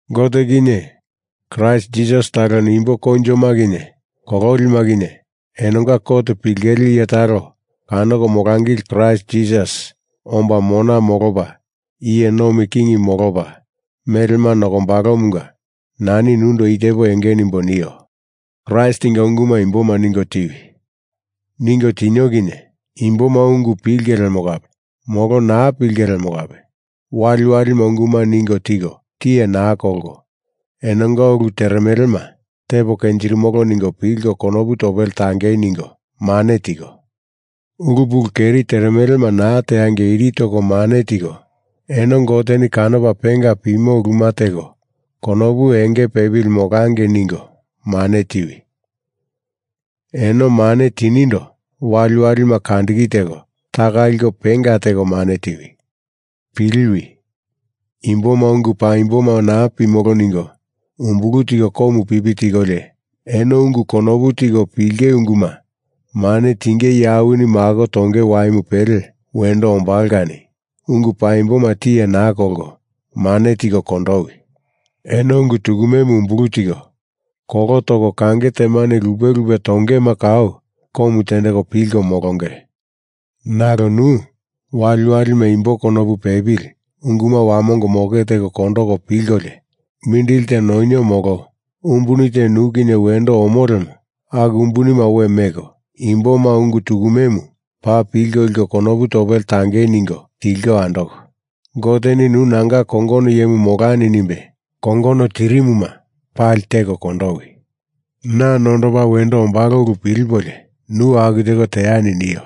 Gote kinye Kraist Jisasi taloni imbo koinjoma kinye kololima kinye enonga kot pilingele iye talo kanoko molangili Kraist Jisasi omba mona molopa iye nomi king molopa melema nokombalomunga nani nundo i tepo enge nimbo nio. Kraistinga unguma imboma ningo tiwi. Ningo tinio kinye imboma ungu pilinge lemo kape molo naa pilinge lemo kape waliwalima unguma ningo tiko tiye naa kolko, enonga ulu teremelema tepo kenjirimolo ningo pilko konopu topele tangei ningo mane tiko, ulu pulu keri teremelema naa teangei iri toko mane tiko, eno Goteni kanopa penga pimo uluma teko konopu enge pepili molangei ningo mane tiwi. Eno mane tinindo waliwalima kandiki teko taka liko penga teko mane tiwi. Piliwi! Imboma ungu paimboma naa pimolo ningo umbulu tiko komu pipi tikolio, eno ungu konopu tiko pilinge unguma mane tinge iye awini mako tonge waimu pele wendo ombalo kani ungu paimboma tiye naa kolko mane tiko kondowi. Eno ungu tukumemu umbulu tiko, kolo toko kange temane lupe lupe tongema kau komu tendeko pilko molonge. Nalo nu, waliwalima imbo konopu pepili unguma wamongo moke teko kondoko pilkolio, mindili te nonio molo umbuni te nu kinye wendo omo lemo aku umbunima we meko, imboma ungu tukumemu paa pilko liko konopu topele tangei ningo tilko andoko, Goteni nu nanga kongono iyemu molani nimbe kongono tirimuma pali teko kondowi. Na nondopa wendo ombalo ulu pilipolio nu aku teko teani nio.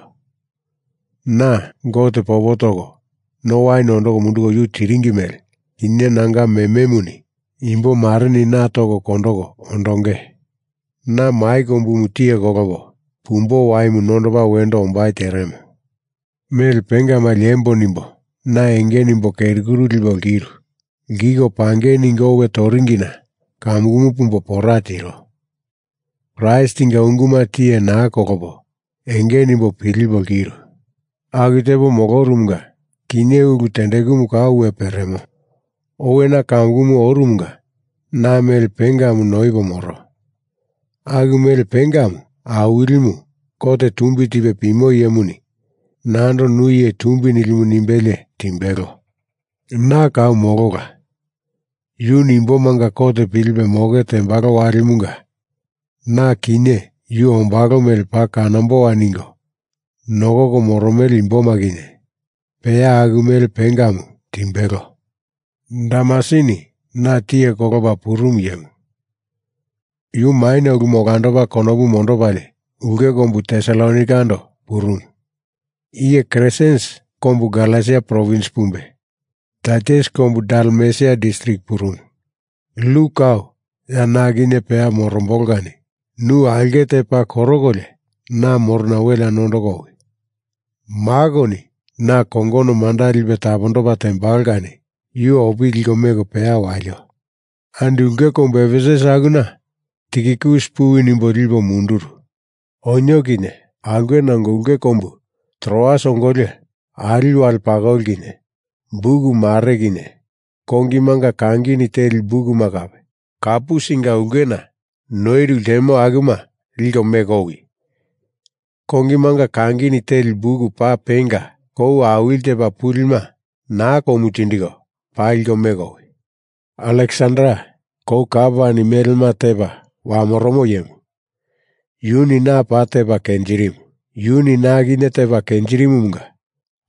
Na, Gote popo toko no wain ondoko munduko yu tiringi mele, kinye nanga mememuni imbomareni na toko kondoko ondonge. Na mai kombumu tiye kolopo pumbo waimu nondopa wendo ombai teremo. Mele pengama liembo nimbo na enge nimbo keri kuru lipo lkiru. Lkiko pangei ningo owe toringina kamukumu pumbo pora tiro. Kraistinga unguma tiye naa kolopo enge nimbo pilipo lkiru. Aku tepo molorumunga kinye, ulu tendekumu kau we peremo. Owena kamukumu oromunga na mele pengamu noipe moromo, aku mele pengamu Awilimu, kot tumbi tipe pimo iyemuni nando nu iye tumbi nilimu nimbelie timbelo. Na kau molola. Yuni imbomanga kot pilipe moke tembalo walimunga na kinye yu ombalo mele paa kanamboa ningo nokoko moromele imboma kinye peya aku mele pengamu timbelo. Demasini na tiye kolopa purumu iyemu yu maina uluma olandopa konopu mondopalie ulke kombu Tesalonaikando purumu. Iye Kresens kombu Galesia provins pumbe, Taitus kombu Dalmesia distrik purumu. Luk kau ya na kinye peya morombolo kani nu aulke te paa korokolio na morona welea nondoko owi. Makoni na kongono manda lipe tapondopa tembalo kani yu opili liko meko peya walio. Andi ulke kombu Efesus akuna Tikikus puwi nimbo lipo munduru. Onio kinye aulkena ongo ulke kombu Troas ongolio, ali wale pakoli kinye buk mare kinye kongimanga kangini teli bukuma kape, Karpusinga ulkena noiru ltemo akuma liko meko owi. Kongimanga kangini teli buk paa penga, kou awili tepa pulima naa komu tindiko paa liko meko owi. Aleksander, kou kapani melema tepa wamoromo iyemu, yuni na paa tepa kenjirimu. Yuni na kinye tepa kenjirimumunga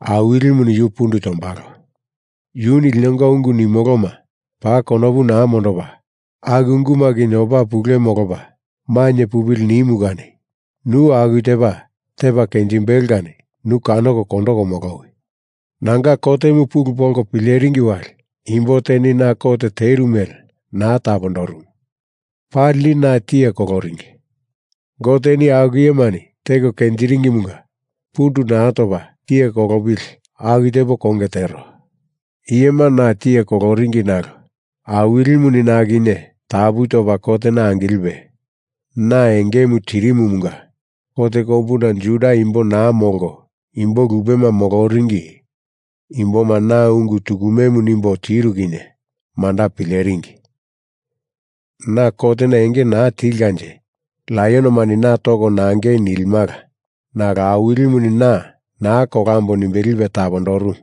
Awilimuni yu pundu tombalo. Yuni linonga ungu nimoloma paa konopu naa mondopa aku unguma kinye opa pule molopa mainye pupili nimu kani nu aku tepa tepa kenjimbelo kani yu kanoko kondoko molowi! Nanga kotemu pulu polko pileringi wali imbo teni na kot teru mele naa tapondorumu. Palini na tiye koloringi. Goteni aku iyemani teko kenjiringimunga pundu naa topa tiye kolopili aku tepo konge tero. Iyema na tiye koloringi nalo Awilimu na kinye tapu topa kotena angilipe na engemu tirimumunga kot kombuna Juda imbo naa molko imbo lupema moloringi imboma na ungu tukumemu nimbo tiru kinye manda pileringi. Na kotena enge naa tilkanje laionomani na toko nangei nilimala nalo Awilimuni na naa kolambo nimbe lipe tapondorumu.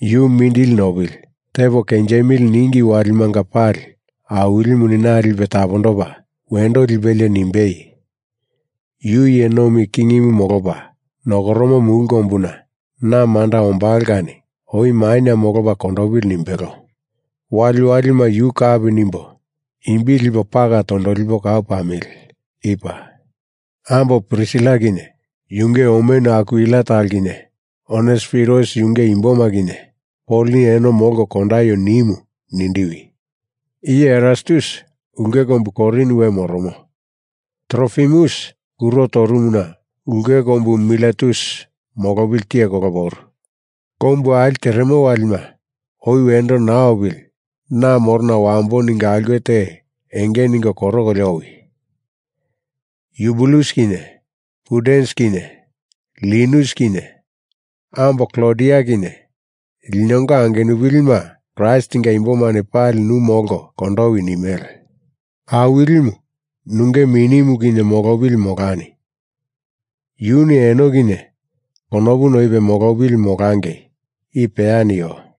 Yu mindili nopili, tepo kenjimili ninge walimanga pali Awilimuni na lipe tapondopa wendo lipelie nimbei, yu iye nomi kingimu molopa nokoromo mulu kombuna na manda ombalo kani oi maina molopa kondopili nimbelo. Waliwalima yu kapi nimbo imbi lipo pala tondolipo kau pamili. I paa. Ambo Prisila kinye yunge omenu Akwila talo kinye, Onesiforus yunge imboma kinye, Poloni eno molko kondaio nimu nindiwi. Iye Erastus ulke kombu Korin we moromo. Trofimus kuro torumuna ulke kombu Miletus molopili tiye kolopo oru. Kombu ali teremo walima oi wendo naa opili na morona wambo ningo aulke te enge ningo korokolio owi. Yubulus kinye Pudens kinye Linus kinye ambo Klodia kinye linonga angenupilima Kraistinga imbomani pali nu molko kondowi nimele. Awilimu nunge minimu kinye molopili molani. Yuni eno kinye konopu noipe molopili molangei. I peya nio.